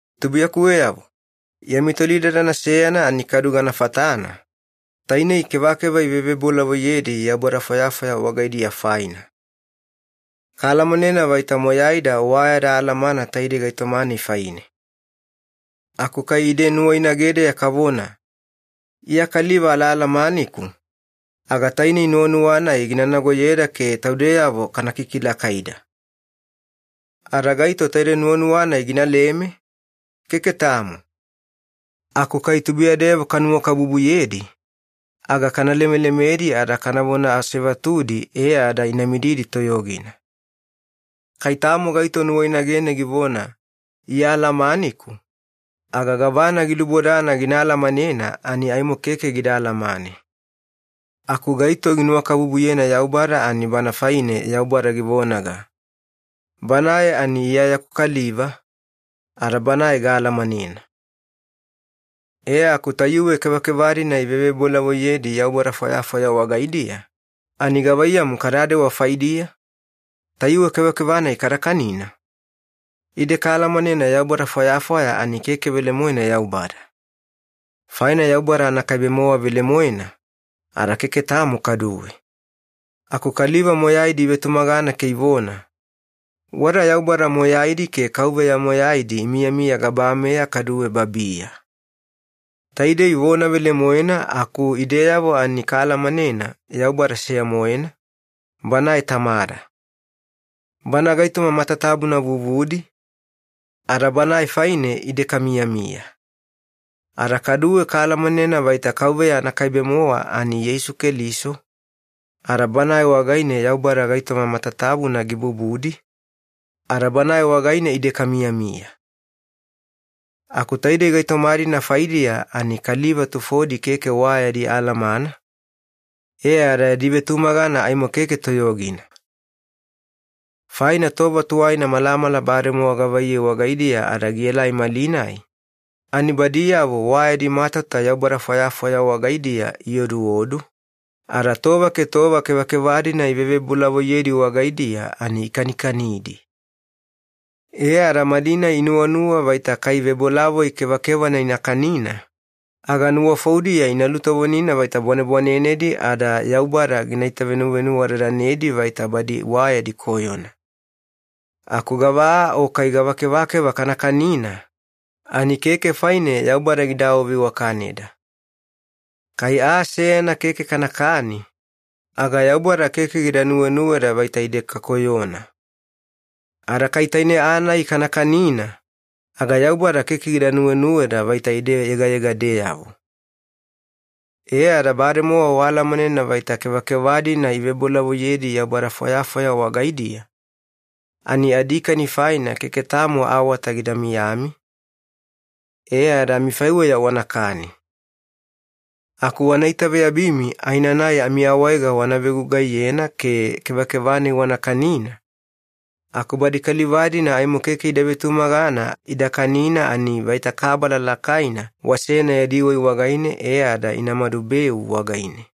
Tubuiyakuweyavo, yami tolidadana seyana ani kadu gana fatana, tainei kevakeva ivevebolavoiyedi yaubada fwayafwaya wagaidiya faina. Kaalamanena vaita moyaida wa yada alamana taidei gaitoma-nai faine. Aku kai ide nuwainagedeya kavona, “Iya kaliva alaalamaniku,” aga tainei nuwanuwa-nai gina nagoyeda ke taudeyavo kana kikilakaida. Ada gaito taide nuwanuwa-nai gina leme? Keke tamo. Aku kai tubuiyadeyavo kanuwakabubuyedi, aga kana lemelemedi ada kanavona asevatudi e ada ina mididi toyogina. Kai tamo gaito nuwainagene givona, “Iya alamaniku,” aga gavana gilubodana gina alamanena ani aimo keke gida alamane. Aku gaito ginuwakabubuyena Yaubada ani bana faine Yaubada givonaga, “Banae ani Iya yaku kaliva, ada banae gaalamanena.” E aku tayuwe kevakeva-dina ivevebolavoiyedi yaubada fwayafwaya wagaidiya, ani gavaiyamu kadadewa faidiya? Tayuwe kevakeva-nai kada kanina? Ide kaalamanena yaubada fwayafwaya ani keke velemoena Yaubada. Faina Yaubada anakaibe-mowa velemoena, ada keke tamo kaduwe. Aku kaliva moyaidi ivetumagana ke ivona, “Wada yaubada moyaidi ke kauveya moyaidi imiyamiya gabameya kaduwe babiya.” Taidei vona velemoena aku ideyavo ani kaalamanena Yaubada seya-moena, Banae Tamada. Bana gaitoma matatabuna vuvudi, ada Banae faine ide kamiyamiya. Ada kaduwe kaalamanena vaita Kauveya anakaibe-mowa ani Yeisu Keliso, ada Banae wagaine Yaubada gaitoma matatabuna gibubudi, ada Banae wagaine ide kamiyamiya. Aku taidei gaitoma-dina faidiya ani kaliva tufodi keke wa yadi alamana, e ada yadi vetumagana aimo keke toyogina. Faina tova tuwaina malamala bademowa gavaiyei wagaidiya ada gielai malinai, ani badiyavo wa yadi matauta yaubada fwayafwaya wagaidiya ioduodu, ada tova ke tova kevakeva-dina ivevebolavoiyedi wagaidiya ani ikanikanidi. E ada malinai inuwanuwa vaita kai vebolavoi kevakevana ina kanina, aga nuwafoudiya ina lutovonina vaita bwanebwanenedi ada Yaubada gina itavenuvenuwadadanedi vaita badi wa yadi koyona. Aku gava aa o kai gava kevakeva kana kanina, ani keke faine Yaubada gida awaveiwakaneda. Kai aa seyana keke kanakani, aga Yaubada keke gida nuwenuweda vaita ide kakoyona. Ada kai taine aa-nai kana kanina, aga Yaubada keke gida nuwenuweda vaita ide yegayegadeyavo. E ada bademowa waalamanena vaita kevakeva-dina ivebolavoiyedi yaubada fwayafwaya wagaidiya, ani adikani faina keke tamo awata gida miyami, e ada amifaiweya wanakani. Aku wana itaveyabimi aenanai amiawaega wana vegugaiyena ke kevakeva-nai wana kanina, aku badi kaliva-dina aimo keke ida vetumagana ida kanina ani vaita kabala lakaina wasena yadi wai wagaine e ada ina madubeu wagaine.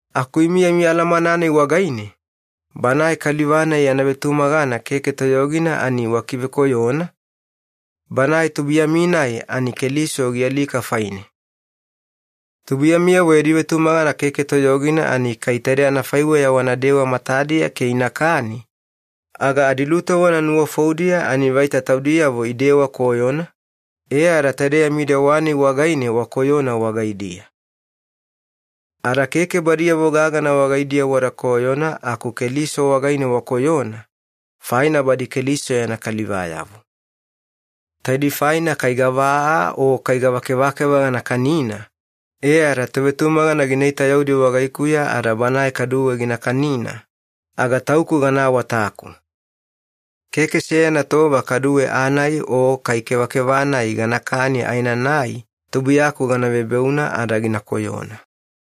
Aku imi yami alamana-nai wagaine, banae kaliva-nai yana vetumagana keke toyogina ani wakivekoyona, banae tubuiyami-nai ani Keliso gialika faine. Tubuiyamiyavo yadi vetumagana keke toyogina ani kai taide anafaiweya wanadewa matadiya ke inakani, aga adilutovona nuwafoudiya ani vaita taudiyavo idewa koyona, e ada taide yami dewa-nai wagaine wakoyona wagaidiya. Ada keke badiyavo gagana wagaidiya wada koyona aku Keliso wagaine wakoyona, faina badi Keliso yana kalivayavo. Taidei faina kai gava aa o kai gava kevakeva gana kanina e ada tovetumagana gina itayaudi wagaikuya ada banae kaduwe gina kanina, aga tauku gana awataku. Keke seyana tova kaduwe aa-nai o kai kevakeva-nai ganakani aenanai tubuiyaku gana vebeuna ada gina koyona.